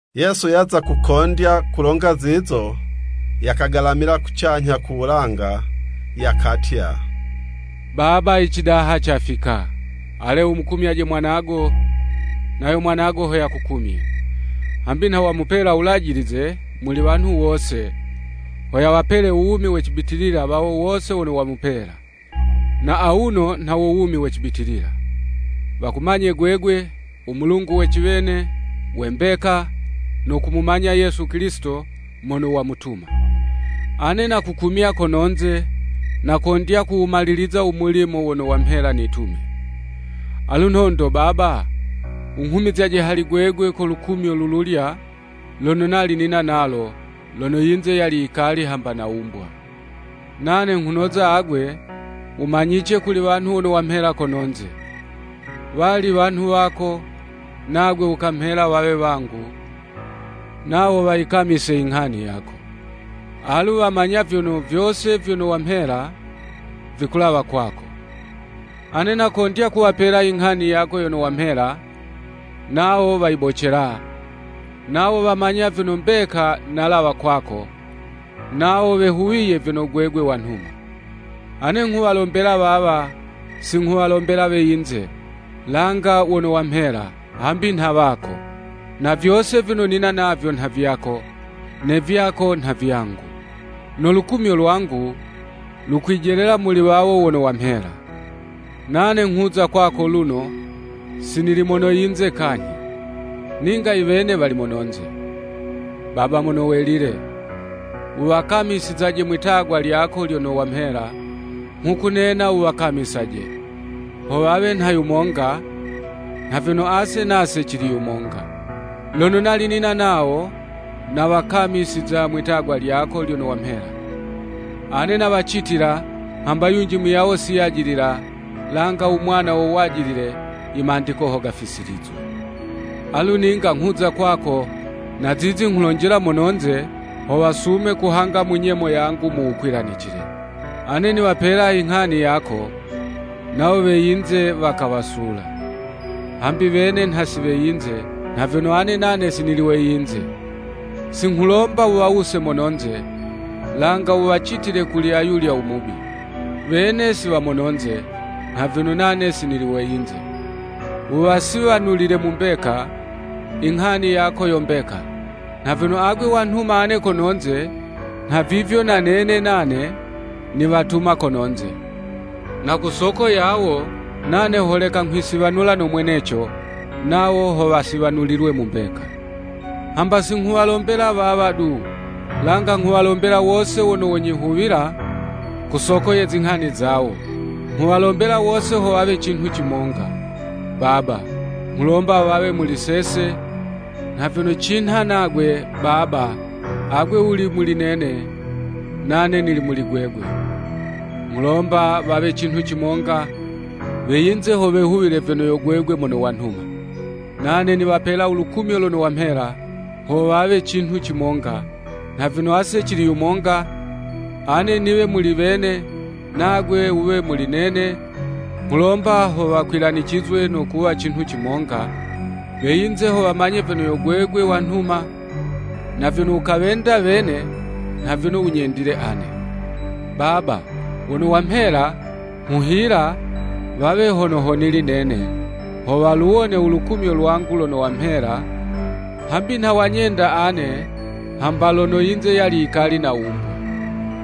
Yesu yaza kukondya kulonga zizo, yakagalamila kucanyha ku wulanga yakatya, “Baba icidaha cafika! Ale wumukumyaje mwanago, nayo mwanago ho yakukumye.” Hambi nha wamupela wulajilize muli wanhu wose, ho yawapele u wumi we cibitilila wawo wose wono wamupela. Na awuno, nha wo wumi we cibitilila, “Wakumanye gwegwe, u Mulungu we ciwene, we mbeka, no kumumanya Yesu Kilisito mono wamutuma.” Ane nakukumya kono'nze, nakondya kuwumaliliza u mulimo wono wamhela nitume. Alu nhondo Baba, wunghumizyaje hali gwegwe ko lukumyo lululya lono nali nina nalo, lono yinze yali yikali hamba nawumbwa. “Nane nghunoza agwe, wumanyice kuli wanhu wono wamhela kononze. Wali wanhu wako, nagwe wukamhela wawe wangu, nawo wayikamise inghani yako. Alu wamanya vyono, vyose vyono wamhela, vikulawa kwako. Ane nakondya kuwapela inghani yako yono wamhela, nawo wayibocela, nawo wamanya vyono mbeka nalawa kwako, nawo wehuwiye vyono gwegwe wanhuma. “Ane nghuwalombela wawa, si nghuwalombela we yinze, langa wono wamhela, hambi nha wako. Na vyose vyono nina navyo nha vyako, ne vyako nha vyangu. No lukumyo lwangu, lukwijelela muli wawo wono wamhela. Nane nghuza kwako luno, si nili mono yinze kanyhi. Ninga iwene wali mononze. Baba Mono Welile, wuwakamisizaje mwitagwa lyako lyono wamhela, nghukunena wuwakamisaje, ho wawe nha yumonga, nha vyono ase nase cili yumonga. Lono nali nina nawo, nawakamisiza mwitagwa lyako lyono wamhela. Ane nawacitila, hamba yunji muyawo si yajilila, langa u mwana wo wajilile, imandiko ho gafisilizwe. Alu ninga nghuza kwako, na zizi nghulonjela mononze, ho wasume kuhanga mu nyemo yangu, mu wukwilanicile. Ane niwapela inghani yako, nawo we yinze wakawasula, hambi wene nha si we yinze, nha vyono ane nane si nili we yinze. Si nghulomba wuwawuse mononze, langa wuwacitile kuli ayulya u Mubi. Wene si wa mononze, nha vyono nane si nili we yinze. Wuwasiwanulile mu mbeka, inghani yako yo mbeka. Nha vyono agwe wanhuma ane kononze, nhavivyo na nene nane, niwatuma kononze. Na ku soko yawo, nane holeka nghwisiwanula no mweneco, nawo ho wasiwanulilwe mu mbeka. “Hamba si nghuwalombela wawa du, langa nghuwalombela wose wono wonyihuwila ku soko ye zinghani zawo. Nghuwalombela wose ho wawe cinhu cimonga. Baba, nghulomba wawe muli sese, nha vyono cinha nagwe, Baba, agwe wuli muli nene, nane nili muli gwegwe. Nghulomba wawe cinhu cimonga, we yinze ho wehuwile vyono yo gwegwe mono wanhuma. Nane niwapela u lukumyo lono wamhela, ho wawe cinhu cimonga, nha vyono ase cili yumonga, ane niwe muli wene, nagwe wuwe muli nene, nghulomba ho wakwilanicizwe no kuwa cinhu cimonga, we yinze ho wamanye vyono yo gwegwe wanhuma, na vyono wukawenda wene nha vyono wunyendile ane. “Baba, wono wamhela, nghuhila, wawe hono ho nili nene, ho waluwone ulukumyo lwangu lono wamhela, hambi nha wanyenda ane hamba lono yinze yali yikali nawumbwa.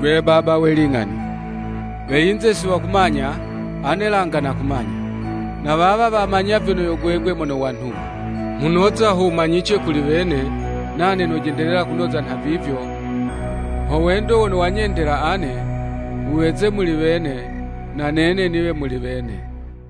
Gwe, Baba we ling'ani, we yize si wakumanya, ane langa nakumanya, na wawa, wamanya vyono yo gwegwe mono wanhuma. Nghunoza ho wumanyice kuli wene, nane nojendelela kunoza nhavivyo, ho wendo wono wanyendela ane, wuweze muli wene, na nene niwe muli wene.”